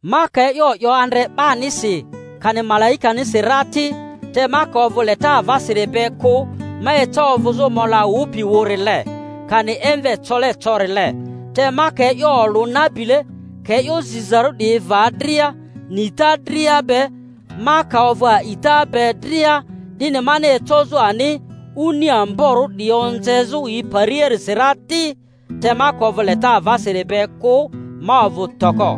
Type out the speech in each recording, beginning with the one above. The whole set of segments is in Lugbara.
Ma ka e'yo 'yo andre 'banisi, kani malaikanisi ra ti, te ka ovᴜ leta avasiri be kᴜ, ma eca ovᴜzᴜ mola wᴜpi wᴜrile, kani emve cole corile. Te ma ka e'yo olᴜ nabile, ka e'yo zizarᴜ 'diyi va dria, nita dria be, ma ka ovᴜ a'ita be dria 'dini mani ecozᴜ ani oni amborᴜ 'diyi onzezᴜ yi pariasi ra ti, te ma ka ovᴜ leta avasiri be kᴜ ma ovᴜ toko.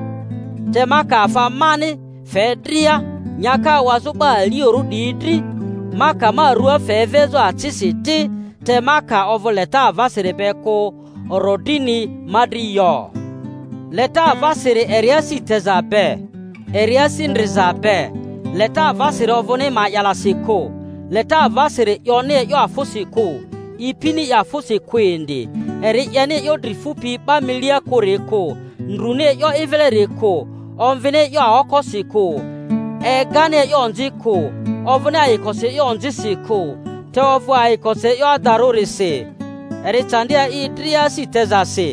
Te ma ka afa mani fe dria nyaka awazᴜ 'ba aliorᴜ 'diyi dri, ma ka ma rᴜa fe evezᴜ acisi ti, te ma ka ovᴜ leta avasiri be kᴜ, orodrini ma dri yo. Leta avasiri eri asi teza be, eri asi ndriza be; leta avasiri ovᴜni ma'yalasi kᴜ; leta avasiri 'yoni e'yo afᴜsi kᴜ, ipini i afᴜsi kᴜ indi, eri 'yeni e'yo dri fupi 'ba milia kᴜri kᴜ, ndruni e'yo i vileri kᴜ, omvini e'yo aokosi kᴜ, egani e'yo onzi kᴜ; ovᴜni ayikosi e'yo onzisi kᴜ, te ovᴜ ayikosi e'yo adarᴜrisi; eri candi a'i dria asi tezasi,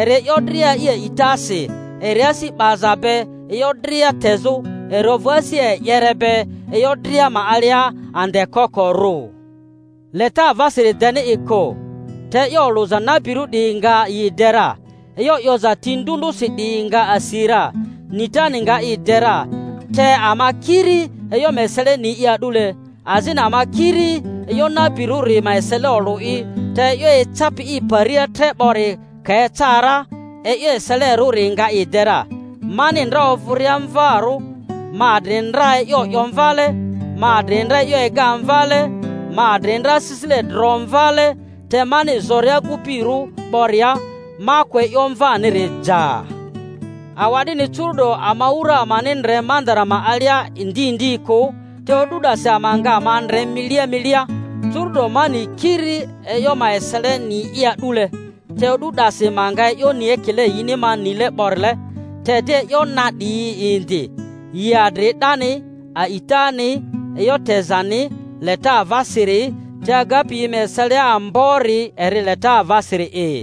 eri e'yo dria a'i a'itasi, eri asi 'baza be e'yo dria tezᴜ, eri ovᴜ asi e'yere be e'yo dria ma alia andekokorᴜ. Leta avasiri deni i kᴜ; te e'yo olᴜza nabirᴜ 'diyi nga yi de ra; e'yo 'yoza ti ndᴜ ndᴜsi 'diyi nga asi ra; nitani nga i de ra. Te ama kiri e'yo ma esele ni'i a'dule, azini ama kiri e'yo nabirᴜri ma esele olᴜ'i; te e'yo ecapi i paria tre 'bori ka eca ra, e'yo eselerᴜri nga i de ra. Mani ndra ovᴜria mvarᴜ ma adri ndra e'yo 'yo mvale, ma adri ndra e'yo ega mvale, ma adri ndra asisile dro mvale; te mani zoria agupirᴜ 'boria ma kᴜ e'yo mvaniri ja. Awa'dini, curu’do ama wura amani ndre mandara ma alia ndi ndi kᴜ, te o'du 'dasi ama nga ama ndre milia milia. Curu'do ma ni kiri e'yo ma eseleni'i a'dule; te o'du 'dasi ma nga e'yo ni ekile yini ma nile 'borile. Te di e'yo na 'diyi indi, yi adri 'dani: a'itani, e'yo tezani, leta avasiri; te agapi yi ma eselia ambori eri leta avasiri'i.